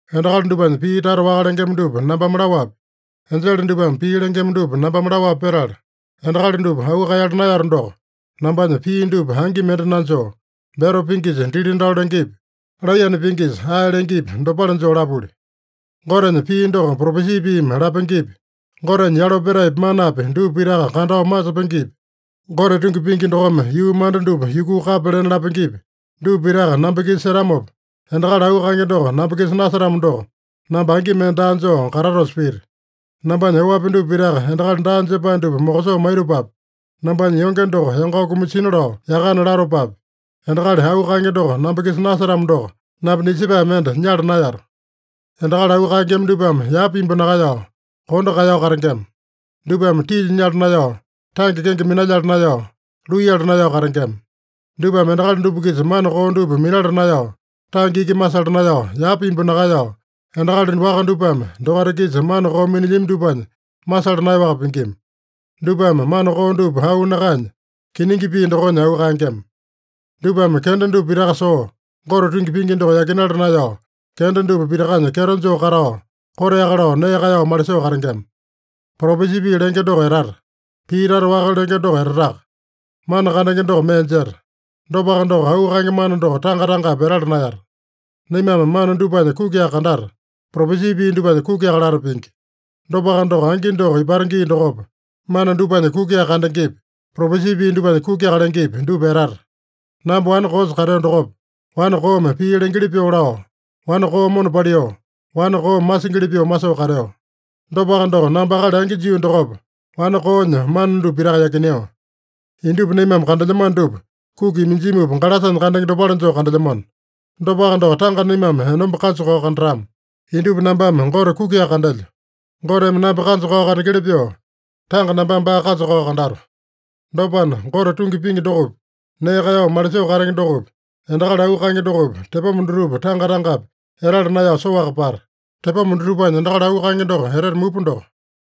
Endakali dupanya pii tata waka lengema dupa nambame laowapi, enjele dupame pii lengema dupa nambame laowapi petala, endakali dupa auu kaeyala naeyato doko, nambanya pii dupa angi mende nanjoo, beto pingisa dili-dalo lengepi, laiyane pingisa ae lengepi, dopale joo lapuli. Gotenya pii doko propesi piimi lapengepi, Gotenya yalo petaepi manapi dupa pitaka kandao masepengepi, Gote tungi pingi dokome yuu manda dupa yukuu kapya lena lapengepi, dupa pitaka namba-kisa setamopa, endakali auu kaenge doko namba-kisa nasetamo doko, namba angi mende daa joo katatosa pita. Nambanya oapi dupa pitaka endakali daa jepae dupa mokosoo maitopapi, nambanya yonge doko yangao kumasina lao yakana latopapi, endakali auu kaenge doko namba-kisa nasetamo doko, namba nisepae mende nyala naeyato. Endakali auu kaengema dupame yapa imbu nakaeyao, kondo kaeyao katengema. Dupame tilya nyala naeyao, tange kenge minalyala naeyao, luiyala naeyao katengema. Dupame endakali dupa-kisa mana koo dupa minala naeyao, tange iki masala naeyao, yapa imbu nakaeyao, endakali waka dupame dokaita-kisa mana koo minilyami dupanya masala naeyaowaka pingima. Dupame mana koo dupa auu nakaenya, kiningi pii dokonya auu kaengema. Dupame kenda dupa pitaka soo, Gote tungi pingi doko yakinala naeyao, kenda dupa pitakanya kyeto joo katao, koteaka lao nee kaeyao malisoo katengema. Propesi pii lenge doko etata. Pii tata waka lenge doko etataka. Mana kandenge doko mee jeta. Dopaka doko, auu kaenge mana doko tanga-tangapi etala naeyata. Naimame mana dupanya kukiaka kandata, propesi pii dupanya kukiaka lata pingi. Dopaka doko, angi doko ipata gii dokopa, mana dupanya kukiaka kandengepi, propesi pii dupanya kukiaka lengepi, dupa etata. Namba wane koosa kateo dokopa, wane koome pii lengeli pyoo lao, wane koo mona paliu, wane koome masingili pyoo masoo kateo. Dopaka doko, namba akali angi jio dokopa, wane koonya mana dupa pitaka yakineo. Indupa naimame kandelyamano dupa, kuki iminjimupa galasanya kandenge dopale joo kandelyamano. Dopaka doko, tanga naimame enomba kanja-kao kandatama. Indupa nambame Gote kukiaka kandelyo. Goteme namba kanja-kao kandengeli pyoo, tanga nambame baa kanja-kao kandato. Dopana, Gote tungi pingi dokopi, nee kaeyao malisoo katenge dokopi, endakali auu kaenge dokopi, tepoma dutupa tanga-tangapi etala naeyao soaka pata. Tepoma dutupanya endakali auu kaenge doko etete mupa doko.